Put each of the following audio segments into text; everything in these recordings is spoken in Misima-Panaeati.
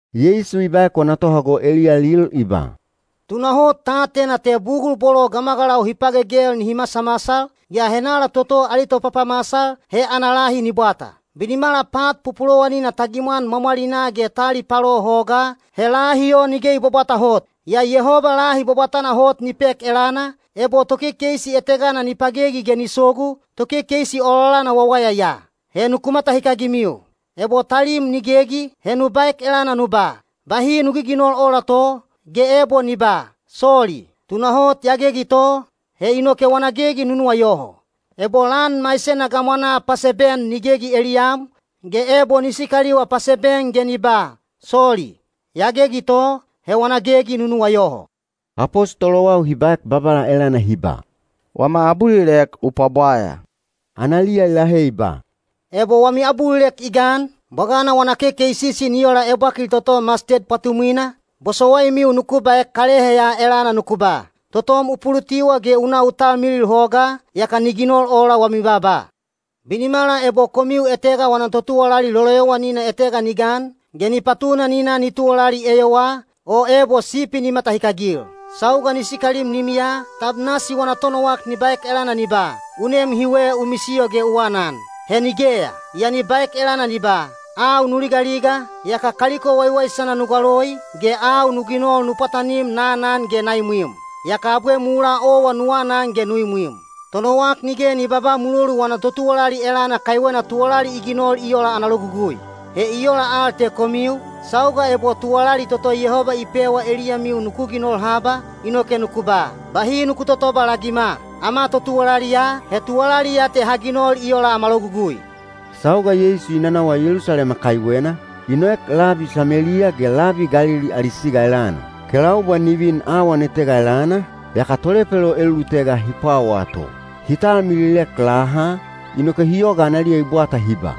Yeisu i baek wana tohago eliyalil i ba, “Tunahot ta atena te bugul bolo gamagalau hi pagegel nihi masamasal, yaa henala toto ali topapamasal, he ana lahi ni bwata. Binimala pat pupulowanina ta gimwan mwamwalinaa ge ta alipalo hogaa, he lahi o nige i bwabwata hot. Yaa Yehoba lahi bwabwatana hot ni pek elana, ebo tokekeisi etegana ni pagegi ge ni sogu, tokekeisi ololana wawaya ya. He nuku matahikagimiu. “Ebo talim ni gegi, he nu baek elana nu ba, ‘Bahi nu giginol ola to,’ ge ebo ni ba, ‘Soli. Tunahot ya gegi to,’ he inoke wana gegi nu nuwayoho. Ebo lan maisena gamwanaa paseben ni gegi eliyam, ge ebo ni sikaliwa paseben ge ni ba, ‘Soli. Ya gegi to,’ he wana gegi nu nuwayoho.” Apostolowau hi baek Babala elana hi ba, “Wama abulilek u pwabwaya.” Analiya i lahe i ba, “Ebo wami abulilek i gan, bwagana wana kekeisisi ni ola ebwakil toto masted pwatumwina, bosowaimiu nuku baek kalehe ya elana nuku ba, ‘Totom u pulutiwa ge u na u talmilil hogaa,’ yaka ni ginol ola wami baaba. “Binimala ebo komiu etega wana totuwalali loloyowanina etega ni gan, ge ni patuna ni na ni tuwalali eyowaa, o ebo sipi ni matahikagil. Sauga ni sikalim limiya, tab nasi wana tonowak ni baek elana ni ba, ‘U nem hiwe u misiyo ge u anan’? He nigeya. Yaa ni baek elana ni ba, ‘Au nu ligaliga, yaka kaliko waiwaisana nu galoi, ge au nu ginol nu pwatanim na anan ge na imwim. Yaka abwe mulaa owa nu anan ge nu imwim.’ Tonowak nige ni babaa mulolu wana totuwalali elana kaiwena tuwalali i ginol i ola ana logugui. He i ola al te komiu, sauga ebo tuwalali toto Yehoba i pewa eliyamiu nuku ginol haba, inoke nuku ba, ‘Bahi nuku totobalagima. Ama totuwalali ya, he tuwalali ya te ha ginol i ola ama logugui.’” Sauga Yeisu i nanawa Yelusalema kaiwena, i noek labi Sameliya ge labi Galili ali siga elana. Kelaubwa ni vin awan etega elana, yaka tolepelo elulutega hi pwawaa to. Hi talmililek laha, inoke hi yoga analiya i bwata hi ba,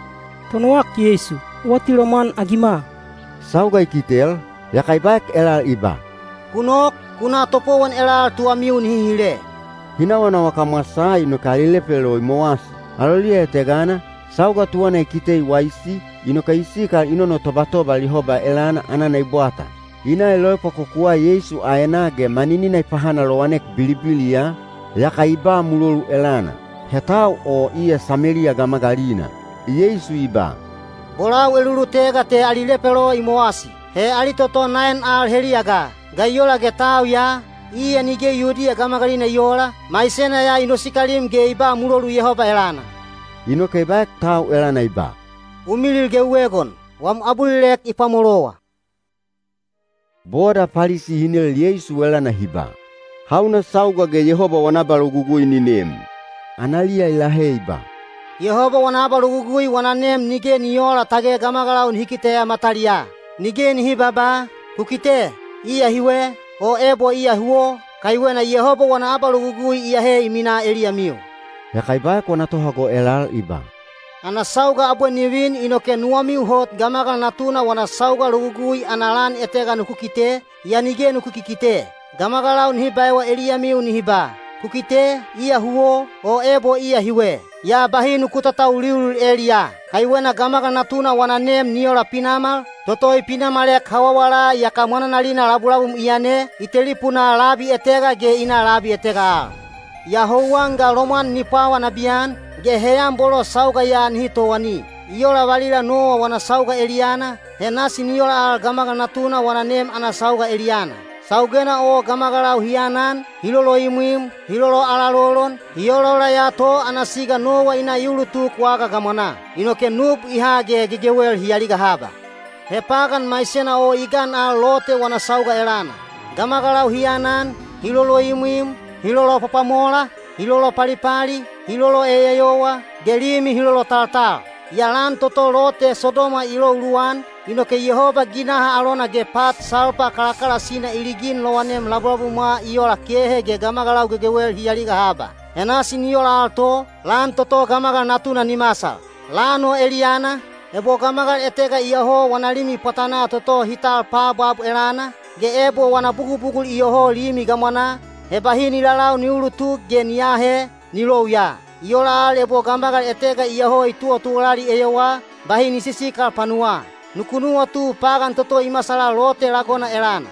“Tonowak Yeisu, u atilomwan-agima!” Sauga i kitel, yaka i baek elal i ba, “Ku nok, ku na topowon elal tuwamiu nihi hile.” Hi nawanawa kamwasaa inoke ali lepelo i mowasi. Aloliya etegana, sauga tuwana i kite i waisi, inoke i sikal i nonotobatobal Yehoba elana anana i bwata. I na i loepwakokuwa Yeisu aenaa ge maninina i pahanalowanek bilibiliya, yaka i ba mulolu elana. He tau o iya Sameliya gamagalina. Yeisu i ba, “Bolau elulutega te ali lepelo i mowasi. He ali toto naen al heliya ga? Ga i ola ge tau ya, iya nige Yudiya gamagalina i oola, maisena ya i nosikalim ge i ba mulolu Yehoba elana?” Inoke i baek tau elana i ba, “U milil ge u egon; wam abulilek i pwamolowa.” Boda Palisi hi nel Yeisu elana hi ba, “Hauna sauga ge Yehoba wana abalogugui ni nem?” Analiya i lahe i ba, “Yehoba wana abalogugui wana nem nige ni oola tage gamagalau nihi kiteya mataliyaa. Nige nihi babaa, ‘Ku kite, iya hiwe’, o ebo ‘Iya huwo,’ kaiwena Yehoba wana abalogugui iyahe i minaa eliyamiu.” Yaka i baek wana tohago elal i ba, “Ana sauga abwe ni vin inoke nuwamiu hot Gamagal Natuna wana sauga logugui ana lan etega nuku kite, yaa nige nuku kikite. Gamagalau nihi baewa eliyamiu nihi ba, ‘Ku kite, iya huwo,’ o ebo ‘Iya hiwe.’ Yaa bahi nuku tatauliulil eliyaa. Kaiwena Gamagal Natuna wana nem ni ola pinamal, toto i pinamalek hawawala yaka mwananalina labulabum i yane, i telipunaa labi etega ge i na labi etega al. Yaa houwan ga lomwan ni pwawa nabiyan, ge heyan bolo sauga ya nihi towani. I ola valila Nowa wana sauga eliyana, he nasi ni ola al Gamagal Natuna wana nem ana sauga eliyana. Saugena o gamagalau hi aanan, hi loloimwim, hi loloalalolon, hi olaola ya to ana siga Nowa i na i ulutuk waga gamwanaa. Inoke nub i ha ge gegewel hi aliga haba. He pagan maisena o i gan al Lote wana sauga elana. Gamagalau hi aanan, hi loloimwim, hi lolopwapwamola, hi lolopalipali, hi loloeyeyowa, ge limi hi lolotaltal. Yaa lan toto Lote Sodoma i lou luwan, inoke Yehoba ginaha alona ge pat salpa kalakalasina i ligin lowanem labulabumwa i ola kehe ge gamagalau gegewel hi aliga haba. He nasi ni ola to, lan toto Gamagal Natuna ni masal. Lan o eliyana, ebo gamagal etega iyoho wana limi pwatanaa toto hi tal paabwab elana, ge ebo wana bugubugul iyoho limi gamwanaa, he bahi ni lalau ni uulutuk ge ni aahe, ni lou ya. I ola al ebo gamagal etega iyoho i tuwatuwalali eyowaa, bahi ni sisikal panuwaa. Nuku nuwatu pagan toto i masala Lote lagona elana.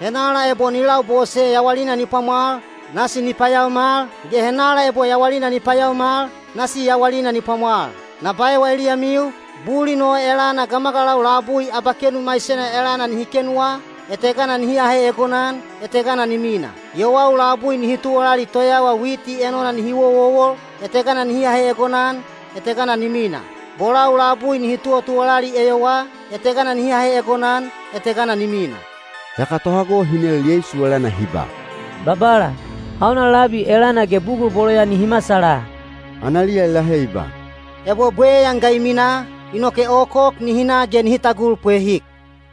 Henala ebo ni labose yawalina ni pwamwal, nasi ni payaomal, ge henala ebo yawalina ni payaomal, nasi yawalina ni pwamwal. Na baewa eliyamiu, bulin o elana gamagalau labui abakenu maisena elana nihi kenuwa, etegana nihi ahe egonan, etegana ni mina. Yowau labui nihi tuwalali toyawa witi enona nihi wowowol, etegana nihi ahe egonan, etegana ni mina. Bolau labui nihi tuwatuwalali eyowaa, etegana nihi ahe egonan, etegana ni mina.” Yaka tohago hi nel Yeisu elana hi ba, “Babala, hauna labi elana ge bugul bolo ya nihi masala?” Analiya i lahe i ba, “Ebo bweyan ga i minaa, inoke okok nihi na ge nihi tagul pwehik.”